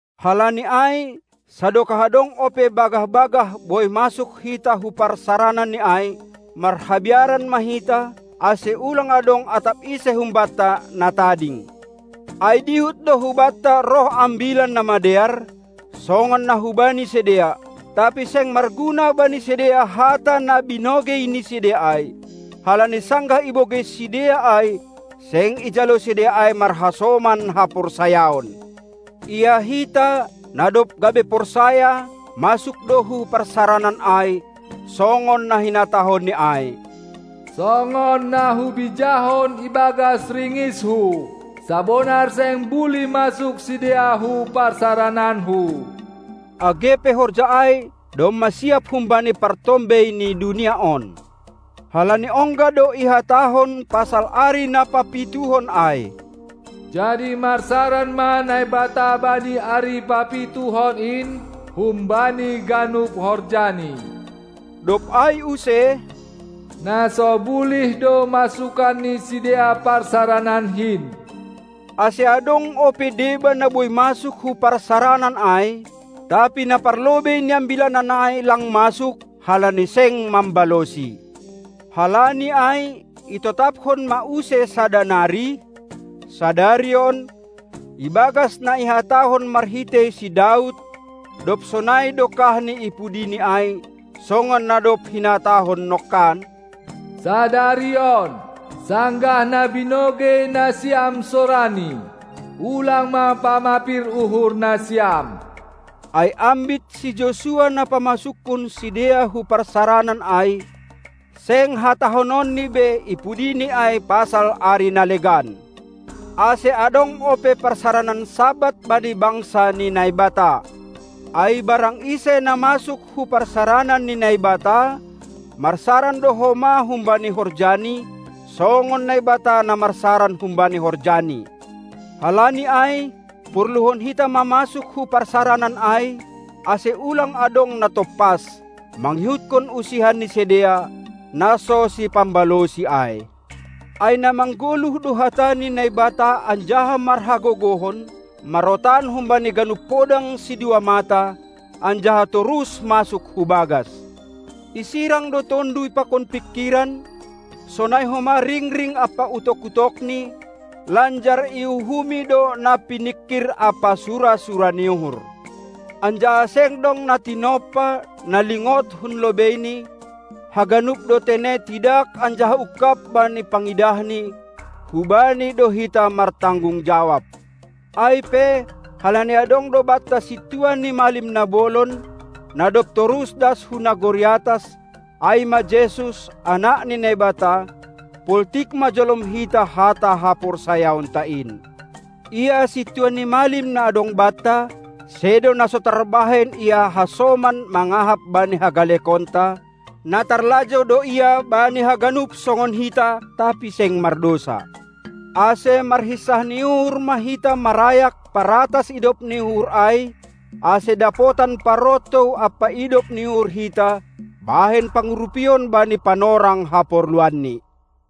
Halani ai, sadokah adong ope bagah-bagah boi masuk hita hu parsarananNi ai, marhabiaran ma hita, ase ulang adong atap ise humbanta na tading. Ai dihut do hubanta roh ambilan na madear, songon na hubani sidea; tapi seng marguna bani sidea hata na binogei ni sidea ai, halani sanggah ibogei sidea ai, seng ijalo sidea ai marhasoman haporsayaon. Ia hita, na dob gabe porsaya, masuk do hu parsaranan ai, songon na hinatahonni ai: "Songon na hubijahon ibagas ringisHu: Sabonar seng bulih masuk sidea hu parsarananKu," age pe horja ai domma siap humbani partombei ni dunia on. Halani ongga do ihatahon pasal ari na papituhon ai: "Jadi marsaran ma Naibata bani ari papituhon in humbani ganup horjani." Dob ai use: "Na so bulih do masukan ni sidea parsarananKin!" Ase adong ope deba na boi masuk hu parsaranan ai, tapi na parlobei niambilanan ai lang masuk, halani seng mambalosi. Halani ai itotaphon ma use sada nari: "Sadari on", ibagas na ihatahon marhitei si Daud, dob sonai dokahni ipudini ai, songon na dob hinatahon nongkan: Sadari on, sanggah na binogei nasiam sorani, ulang ma pamapir uhur nasiam. Ai ambit si Josua na pamasukkon sidea hu parsaranan ai, seng hatahononni be i pudini ai pasal ari na legan. Ase, adong ope parsaranan Sabat bani bangsa ni Naibata. Ai barang ise na masuk hu parsaranan ni Naibata, marsaran do homa humbani horjani, songon Naibata na marsaran humbani horjaNi. Halani ai, porluhon hita ma masuk hu parsaranan ai, ase ulang adong na tompas, mangihutkon usihan ni sidea, na so sipambalosi ai. Ai na manggoluh do hata ni Naibata anjaha marhagogohon, marotan humbani ganup podang sidua mata, anjaha torus masuk hubagas; isirang do tonduy pakon pingkiran, sonai homa ringring ampa utok-utokni, lanjar iuhumi do na piningkir ampa sura-sura ni uhur. Anjaha seng dong na tinompa, na lingod hun lobeini, haganup do tene tidak anjaha ungkab bani pangidahni, hu Bani do hita martanggung jawab. Ai pe, halani adong do banta Sintua ni malim na bolon, na dob torus das hu nagori atas, ai ma Jesus, Anak ni Naibata, poltik ma jolom hita hata haporsayaonta in. Ia Sintua ni malim na adong banta, sedo na so tarbahen Ia hasoman mangahap bani hagalekonta; na tarlajou do Ia bani haganup songon hita, tapi seng mardousa. Ase marhinsah ni uhur ma hita marayak paratas idop ni uhur ai, ase dapotan parontou ampa idop ni uhur hita bahen pangurupion bani panorang haporluanni.